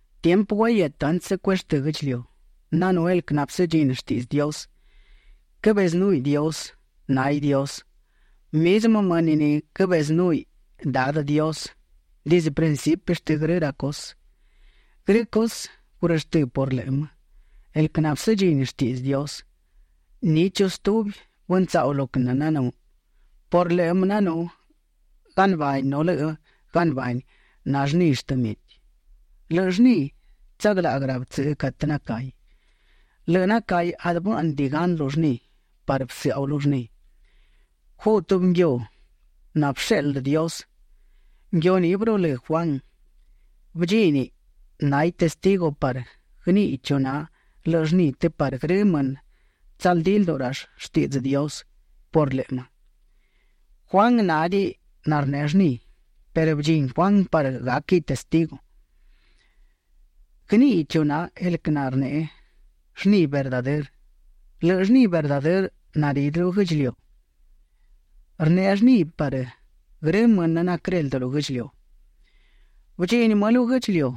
Tiempë guahietë antsë cueshtë́ guë́ꞌdchiliu, nanú el quë nabësëdchini shtiꞌdzë Dios. Quëbezënúhiꞌ Dios. Náhiꞌ Dios. Mizmë mënë ni quëbezënúhiꞌ Dadë Dios dizdë principi shtë grë ra cusë. Grë cusë gurështë́ por lëꞌë më, el quë nabësëdchini shtiꞌdzë Dios; ni chu stubi bëntsaꞌu lo quë nananú. Por lëꞌë më nanú galnabani nu lëꞌë galnabani na llni shtë mieti. Lëꞌë llni tsaglaꞌguë rabtsëꞌë catë nacahi. Lëꞌë nacahi adë bë́ꞌnëdiꞌi gan lu llni parë bësëꞌau lu llni. Guꞌ tubi nguiu nabësheꞌldë Dios. Nguiu ni bërulë́ Juan. Bëdchíniꞌ; náhiꞌ testigu parë guëníꞌiꞌ chu na lëꞌë llni të parë grë mënë tsaldí lduꞌu rall shtiꞌdzë Dios por lëꞌë më. Juan nádiꞌi narneꞌe llni perë bëdchini Juan parë gáquiꞌ testigu; guëníꞌiꞌ chu na el quë narneꞌe llni verdadërë. Lëꞌë llni verdadërë naridë lu guë́ꞌdchiliu, rneꞌe llni parë grë mënë naquëreldë lu guë́ꞌdchiliu. Bëdchini më lu guë́ꞌdchiliu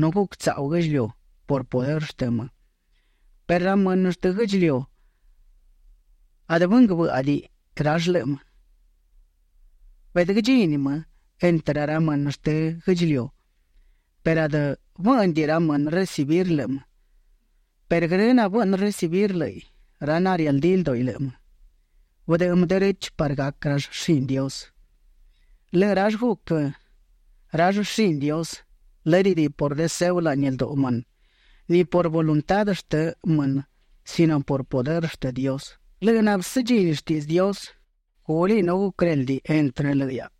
nu guctsaꞌu guë́ꞌdchiliu por pudërë shtë më, perë ra mënë shtë guë́ꞌdchiliu adë bënguë bë́ꞌadiꞌi rall lëꞌë më. Beꞌdë guëdchini më entrë ra mënë shtë guë́ꞌdchiliu perë adë bë́ꞌnëdiꞌi ra mënë recibir lëꞌë më perë grë nabëꞌnë recibir lë́ꞌiꞌ, ra narialdí lduꞌi lëꞌë më, bëdëꞌë më derechë parë gac rall shini Dios. Lëꞌë rall guc rall shini Dios, lë́dëdiꞌi por deseo laꞌni lduꞌu mënë, ni por voluntá shtë mënë sino por pudërë shtë Dios. Lëꞌë nabësëdchini shtiꞌdzë Dios, gúliꞌ nu guquëréldiꞌ entrë lëꞌë hiaꞌa.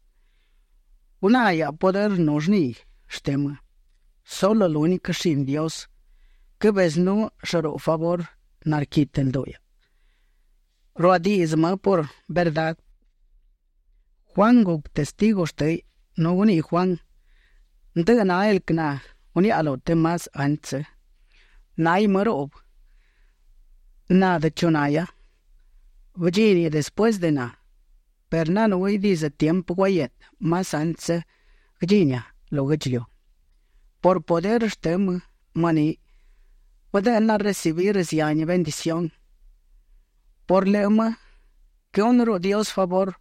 Guná hiaꞌa pudërë nu llni shtë më. Sulë lúniquë shini Dios quëbezënú llëruꞌbë favurë narquitë lduꞌu hiaꞌa. Ruadiꞌdzë më purë verdá. Juan guc testigu shtë́hiꞌ nu guniꞌi Juan: ―Ndëꞌë na el quë naguniaꞌa lu të más antsë, náhiꞌ më ruꞌbë; na adë chu nahia. Bëdchíniꞌ despuësë de na, perë nanúhiꞌ dizdë tiempë guahietë más antsë guëdchinia lu guë́ꞌdchiliu. Por pudërë shtë më ni bëdë́ꞌnaꞌa recibir zihani bendición; por lëꞌë më quëhúnëruꞌu Dios favurë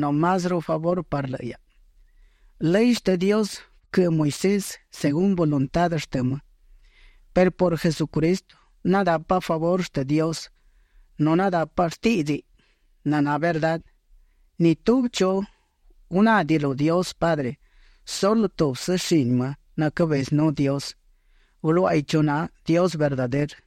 nu más favurë parë lëꞌë hiaꞌa. Lëy shtë Dios bëquëꞌë Moisés según voluntá shtë më, perë por Jesucristo nadápaꞌa favurë shtë Dios, nu nadápaꞌa shtíꞌdziꞌ naná verdá. Ni tubi chu gunádiꞌi lu Dios Padre; sulë tubsë shini më nacabezënú Dios, bëluáꞌaiꞌ chu na Dios verdadërë.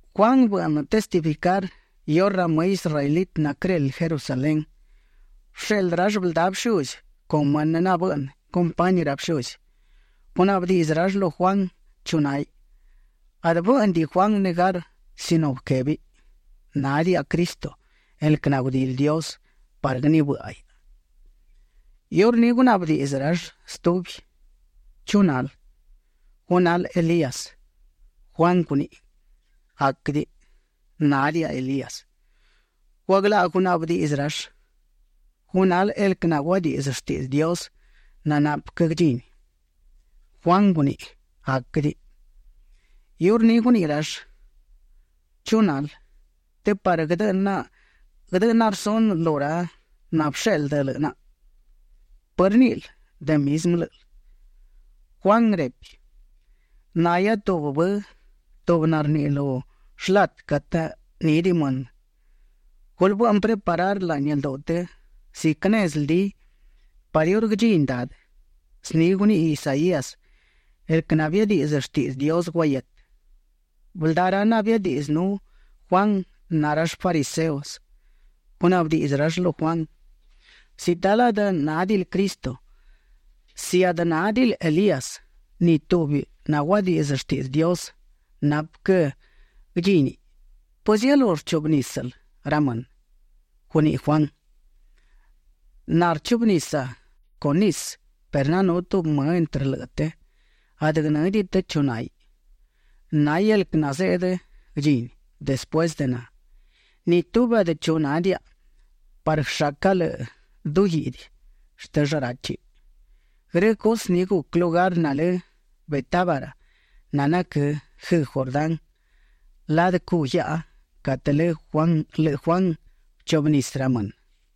Juan bëꞌnë testificar iurë ra më israelitë naquëreldë Jerusalén, bësheꞌldë rall bëldá bëshuzi con mënë nabëꞌnë compañi ra bëshuzi. Gunaꞌbë diꞌdzë rall lu Juan chu náhiꞌ. Adë bë́ꞌnëdiꞌi Juan negar sino bëquébiꞌ: ―Nádiaꞌa Cristo, el quë nagudili Dios parë guënibë́ꞌaiꞌ. Iurní gunaꞌbë diꞌdzë rall stubi: ―¿Chu nal? ¿Gu nal Elías? Juan guniꞌi: ―Aquëdiꞌi; nádiaꞌa Elías. Guaglaꞌguë gunaꞌbë diꞌdzë rall: ―¿Gu nal el quë naguadiꞌdzë shtiꞌdzë Dios nanapë quë guëdchini? Juan guniꞌi: ―Aquëdiꞌi. Iurní guniꞌi rall: ―¿Chu nal? të parë guëdëꞌë naꞌa rsunë lu ra nabësheꞌldë lëꞌë naꞌa. ¿Pë rníꞌil de mizmë lë́ꞌël? Juan repi: ―Nahia tubi bë, tubi narniꞌi lu shlatë catë nídiꞌi mënë: “Gulë bëꞌnë preparar laꞌni lduꞌu të ziquë nezë ldi parë iurë guëdchini Dadë”. Zni guniꞌi Isaías, el quë nabiadiꞌdzë shtiꞌdzë Dios guahietë. Bëldá ra nabiadiꞌdzënú Juan na rall fariseos. Gunaꞌbë diꞌdzë rall lu Juan: ―Si talë adë nádiꞌil Cristo, si adë nádiꞌil Elías, ni tubi naguadiꞌdzë shtiꞌdzë Dios nanapë quë guëdchini, ¿pëzielú rchuꞌbë nísël ra mënë? Guniꞌi Juan: ―Na rchuꞌbë nisa con nisë perë nanú tubi më entrë lëꞌë të, adë guënë́diꞌi të chu náhiꞌ. Náhiꞌ el quë nazeꞌdë guëdchini despuësë de na. Ni tubi adë chu nádiaꞌa parë guëshaca lëꞌë du guiꞌdi shtë shráchiꞌ. Grë cusë ni guc lugar nalë Betábara nanaquë́ guëëꞌgu Jordán ladë cuꞌ guiaꞌa catë lëꞌë Juan bëchuꞌbë nisë ra mënë.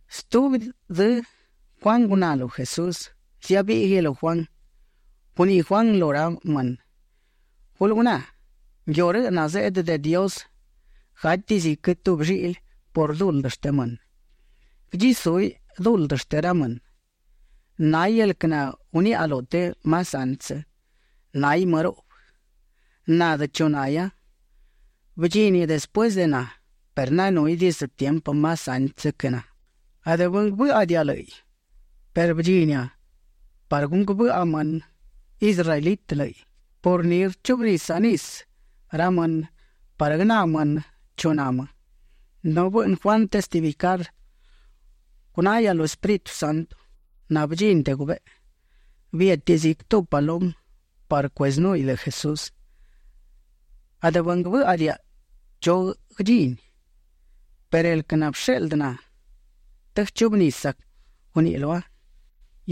Stubi dzë Juan guná lu Jesús; ziabíꞌguiꞌ lu Juan. Guniꞌi Juan lu ra mënë: ―Gulë guná, nguiu rëꞌ nazeꞌdë de Dios; gátiꞌ ziquë tubi lliꞌli por duldë shtë mënë. Guëdchisúhiꞌ duldë shtë ra mënë. Náhiꞌ el quë naguniaꞌa lu të más antsë: “Náhiꞌ më ruꞌbë. Na adë chu nahia. Bëdchíniꞌ despuësë de na perë nanúhiꞌ dizdë tiempë más antsë quë na.” Adë bënguë bë́ꞌadiaꞌa lë́ꞌiꞌ perë bëdchinia parë gunguë bëꞌa mënë israelitë lë́ꞌiꞌ. Por ni rchuꞌbë nisa ra mënë parë guëná mënë chu na më. Nu bëꞌnë Juan testificar: ―Gunahia lu Espíritu Santo nabëdchini de gubeꞌe. Biétiꞌ ziquë tubi palumë parë cuezënúhiꞌ lëꞌë Jesús. Adë bënguë bë́ꞌadiaꞌa chu guëdchini, perë el quë nabësheꞌldë na të guëchuꞌbë nisa, guníꞌiꞌ lua: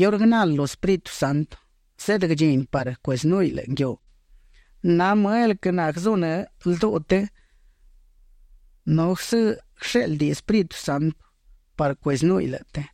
“Iurë guënal lu Espíritu Santo zeꞌdë guëdchini parë cuezënúhiꞌ lëꞌë nguiu, na më el quë naguëzunë́ lduꞌu të nu guëshéꞌldiꞌ Espíritu Santo parë cuezënúhiꞌ lëꞌë të”.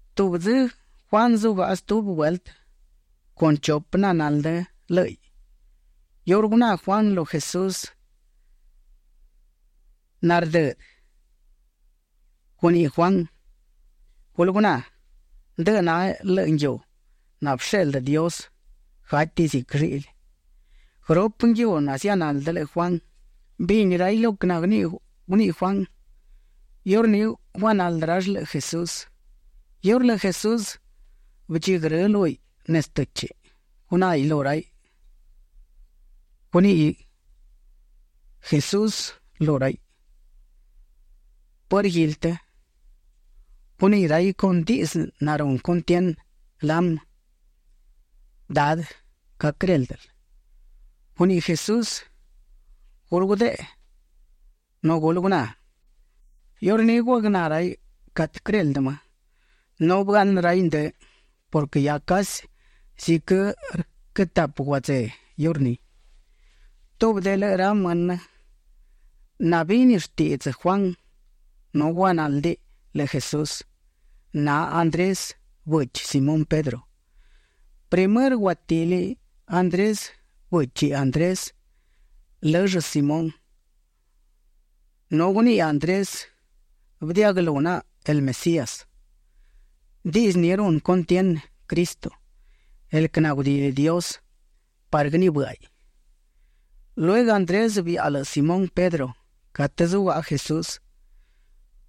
Stubi dzë Juan zugaꞌa stubi vueltë con chupë nanaldë lë́ꞌiꞌ. Iurë guná Juan lu Jesús nardëdë, guniꞌi Juan: ―Gulë guná, ndëꞌë na lëꞌë nguiu nabësheꞌldë Dios; gátiꞌ ziquë lliꞌli. Guërupë nguiu nazianaldë lëꞌë Juan, bini raiꞌ lo quë naguniꞌi Juan. Iurní guanaldë rall lëꞌë Jesús. Iurë lëꞌë Jesús bëdchigrë́ lúhiꞌ nezë të́chiꞌ, gunáhiꞌ lu raiꞌ. Guniꞌi Jesús lu raiꞌ: ―¿Pë rguili të? Guniꞌi raiꞌ con diꞌdzë narunë cuntienë, lamë: ―Dadë, ¿ca quëréldël? Guniꞌi Jesús: ―Gulë gudeꞌe nu gulë guná. Iurní guagná raiꞌ catë quëreldë më, nu bëaꞌnë raiꞌ ndë purquë hia casi ziquë rquë tapë guadzeꞌ iurní. Tubi de lëꞌë ra mënë nabini shtiꞌdzë Juan nu guanáldiꞌ lëꞌë Jesús, na Andrés, bëchi Simón Pedro. Primërë guatili Andrés bëchi Andrés, lëll Simón, nu guniꞌi Andrés: ―Bëdiaꞌguëlú naꞌa el Mesías. (Diꞌdzë ni runë cuntienë, Cristo, el quë nagudili Dios parë guënibë́ꞌaiꞌ.) Lueguë Andrés biaꞌa lëꞌë Simón Pedro catë zugaꞌa Jesús.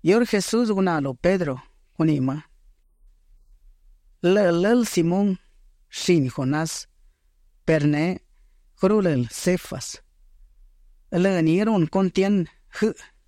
Iurë Jesús guná lu Pedro, guniꞌi më: ―Lë́ꞌël lël Simón, shini Jonás; perë neꞌ guërulël Cefas, (lë ni runë cuntienë guëꞌë).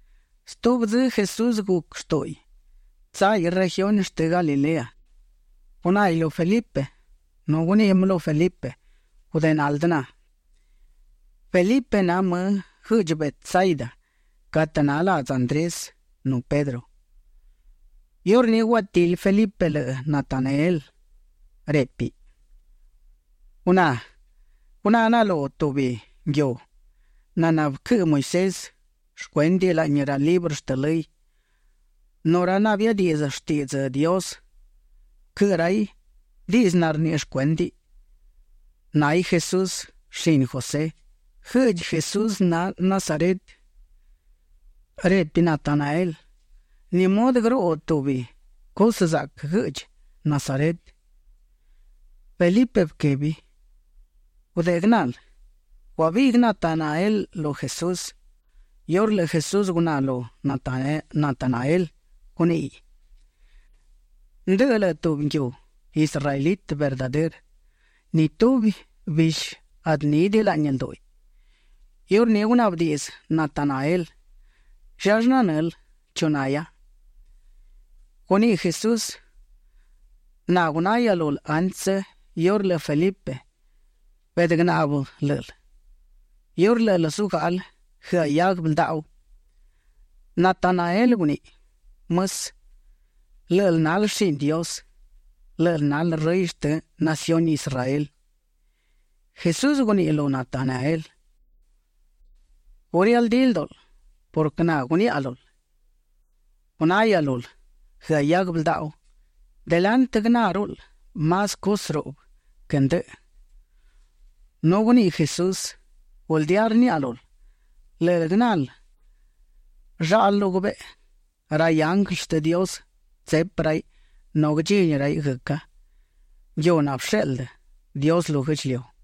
Stubi dzë Jesús guc shtúꞌuiꞌ tsáhiꞌ regiuni shtë Galilea. Gunáhiꞌ lu Felipe nu guniꞌi më lu Felipe: ―Gudeꞌe naldë na. Felipe na më guëꞌdchi Betsaida catë na ladzë Andrés nu Pedro. Iurní guatili Felipe lëꞌë Natanael; répiꞌ: ―Guná naꞌa lu tubi nguiu naná bëquëꞌë Moisés shcuéndiꞌ laꞌni ra librë shtë lëy, nu ra nabiadiꞌdzë shtiꞌdzë Dios bëquëꞌë raiꞌ diꞌdzë narniꞌi shcuéndiꞌ. Náhiꞌ Jesús, shini José. Guëꞌdchi Jesús na Nazaret. Repi Natanael: ―¿Ni mudë guëruꞌu tubi cusë zaꞌquë guëꞌdchi Nazaret? Felipe bëquebi: ―Gudeꞌe guënal. Guabiꞌguë Natanael lu Jesús. Iurë lëꞌë Jesús guná lu Natanael, guníꞌiꞌ: ―Ndëꞌë lëꞌë tubi nguiu israelitë verdadërë. Ni tubi bishi adë nídiꞌi laꞌni ldúꞌiꞌ. Iurní gunaꞌbë diꞌdzë Natanael: ―¿Llallë nanël chu nahia? Guniꞌi Jesús: ―Na gunahia lul antsë iurë lëꞌë Felipe beꞌdë guënaꞌbë lë́ꞌël, iurë lë́ꞌël zugáꞌal guëaꞌ hiaguë bëldaꞌu. Natanael guniꞌi: ―Mësë, lë́ꞌël nal shini Dios. Lë́ꞌël nal Rëy shtë naciuni Israel. Jesús guniꞌi lu Natanael: ―¿Gu rialdí ldúꞌul purquë na guniaꞌa lul, gunahia lul guëaꞌ hiaguë bëldaꞌu? Delantë guënáruꞌul más cusë ruꞌbë quë ndëꞌë. Nu guniꞌi Jesús: ―Guldía rniaꞌa lul, lë́ꞌël guënal llaꞌlë lu gubeꞌe. Ra ianglë shtë Dios tsepi raiꞌ nu guëdchini raiꞌ guëca, nguiu nabësheꞌldë Dios lu guë́ꞌdchiliu.